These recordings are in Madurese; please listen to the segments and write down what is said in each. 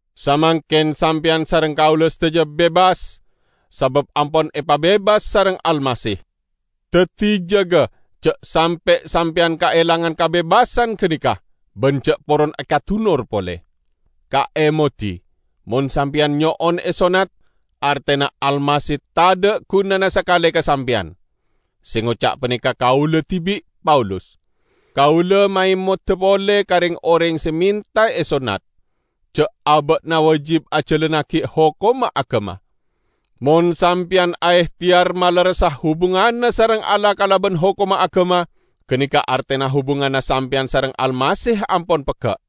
Samangken sampeyan sareng kaula sadaja bebas, sabab ampon epabebas sareng Almasih! Daddi jaga, ja' sampe' sampeyan kaelangan kabebasan ganeka, ban ja' poron ekadunor pole. Kaemodi! Mon sampeyan nyo'on esonnat, artena Almasih tadha' gunana sakale ka sampeyan. Se ngoca' paneka kaula dibi', Paulus. Kaula maemoda pole ka reng-oreng se menta esonnat, ja' aba'na wajib ajalannagi hokomma agama. Mon sampeyan aehteyar malerressa hubunganna sareng Allah kalaban hokomma agama, ganeka artena hubunganna sampeyan sareng Almasih ampon pegga'.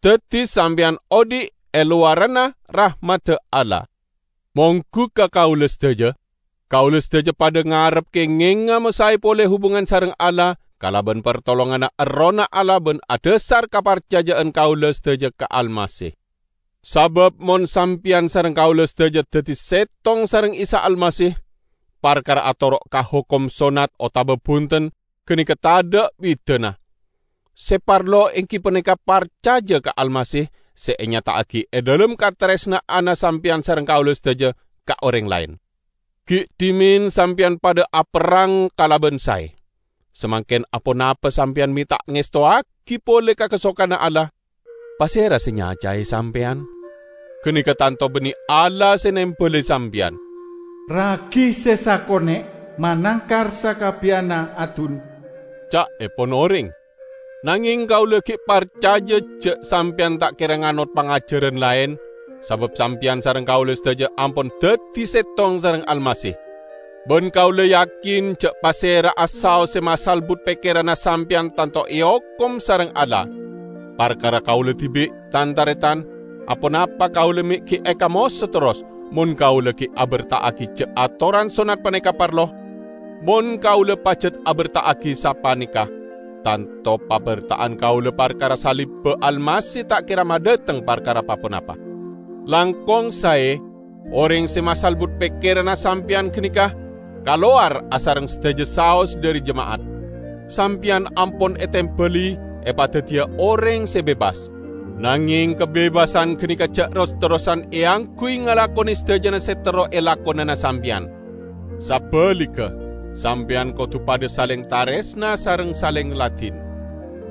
Daddi sampeyan odhi' e lowaranna rahmadda Allah. Monggu ka kaula sadaja, kaula sadaja padha ngarep kengenga masae pole hubungan sareng Allah kalaban partolonganna Errohna Allah ban adhasar kaparcaja'an kaula sadaja ka Almasih. Sabab mon sampeyan sareng kaula sadaja daddi settong sareng Isa Almasih, parkara atoro' ka hokom sonnat otaba bunten, ganeka tadha' bidana. Se parlo enggi paneka parcaja ka Almasih se enyata'agi e dhalem kataresna'anna sampeyan sareng kaula sadaja ka oreng laen. Gi' dhimen sampeyan padha aperrang kalaban sae. Samangken aponapa sampeyan me' ta' ngestowagi pole ka kasokanna Allah? Pasera se nyacae sampeyan? Ganeka tanto banne Allah se nembali sampeyan. "Ragi se sakone' manangkar sakabbiyanna adun," ca'epon oreng. Nangeng kaula gi' parcaja ja' sampeyan ta' kera nganot pangajaran laen, sabab sampeyan sareng kaula sadaja ampon daddi settong sareng Almasih. Ban kaula yakin ja' pasera'a saos se masalbut pekkeranna sampeyan tanto eokom sareng Allah. Parkara kaula dibi', tan-taretan, aponapa kaula me' gi' ekamoso terros, mon kaula gi' aberta'agi ja' atoran sonnat paneka parlo? Mon kaula pajat aberta'agi sapaneka, tanto paberta'an kaula parkara salibba Almasih ta' kera madhateng parkara pa-ponapa. Langkong sae oreng se masalbut pekkeranna sampeyan ganeka kalowar asareng sadaja saos dhari jema'at! Sampeyan ampon etembali epadaddiya oreng se bebas. Nangeng kabebasan ganeka ja' ros-terrosan eangguy ngalakone sadajana se terro elakonana sampeyan. Sabaligga sampeyan kodu padha saleng taresna sareng saleng ladin.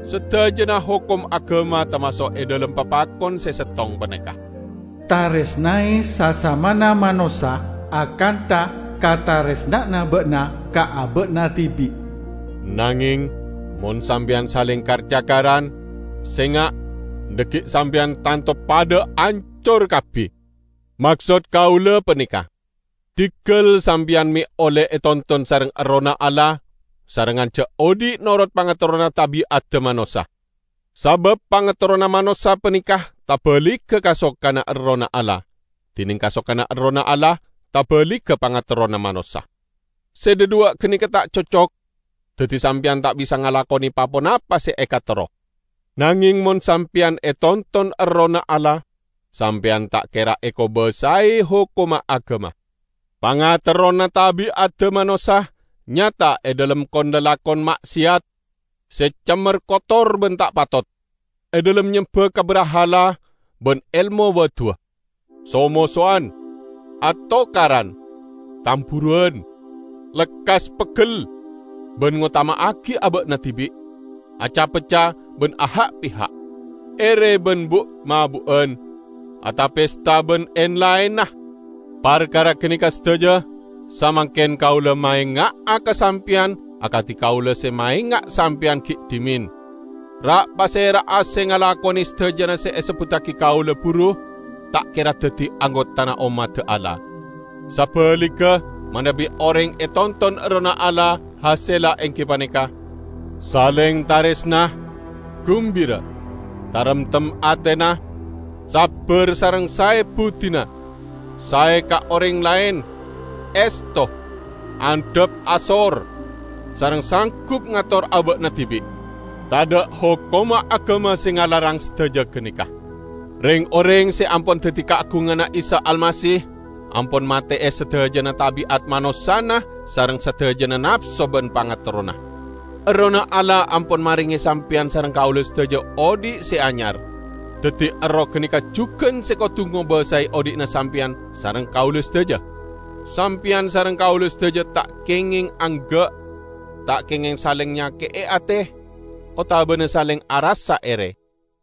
Sadajana hokom agama tamaso' e dhalem papakon se settong paneka: "Taresnae sasamana manossa akantha kataresna'anna ba'na ka aba'na dibi'." Nangeng, mon sampeyan saleng kar-cakaran, senga', dhaggi' sampeyan tanto padha ancor kabbi. Maksod kaula paneka: Diggal sampeyan me' olle etonton sareng Errohna Allah, sarengngan ja' odhi' noro' pangaterrona tabi'adda manossa. Sabab pangaterrona manossa paneka tabaligga kasokanna Erroh Allah, dineng kasokanna Erroh Allah tabaligga pangaterrona manossa. Se dhadhuwa' ganeka ta' cocok, daddi sampeyan ta' bisa ngalakone pa-ponapa se ekaterro. Nangeng mon sampeyan etonton Errohna Allah, sampeyan ta' kera ekobasae hokomma agama. Pangaterrona tabi'adda manossa nyata e dhalem kon-lalakon ma'seyat, se cemmer kotor ban ta' patot; e dhalem nyemba ka brahala ban elmo wa'-duwa'; so-mosowan, atokaran, tamburuwan, lekkas peggel ban ngotama'agi aba'na dibi'; aca-pecca ban aha'-piha'; ere ban bu'-mabu'an, ata-pesta ban en-laenna. Parkara ganeka sadaja, samangken kaula maenga'a ka sampeyan akadi kaula se maenga' sampeyan gi' dhimen: ra'-pasera'a se ngalakone sadajana se esebbuttagi kaula buru ta' kera daddi anggotana ommadda Allah. Sabaligga, manabi oreng etonton Errohna Allah, hasella enggi paneka: Saleng taresna, gumbira, taremtem atena, sabbar sareng sae buddina, sae ka oreng laen, esto, andhap asor, sareng sanggup ngator aba'na dibi'. Tadha' hokomma agama se ngalarang sadaja ganeka. Reng-oreng se ampon daddi kaagunganna Isa Almasih, ampon mate'e sadajana tabi'at manossana sareng sadajana napso ban pangaterrona. Errohna Allah ampon marenge sampeyan sareng kaula sadaja odhi' se anyar; daddi Erroh ganeka jugan se kodu ngobasae odhi'na sampeyan sareng kaula sadaja. Sampeyan sareng kaula sadaja ta' kengeng angga', ta' kengeng saleng nyake'e ate, otabana saleng arassa ere.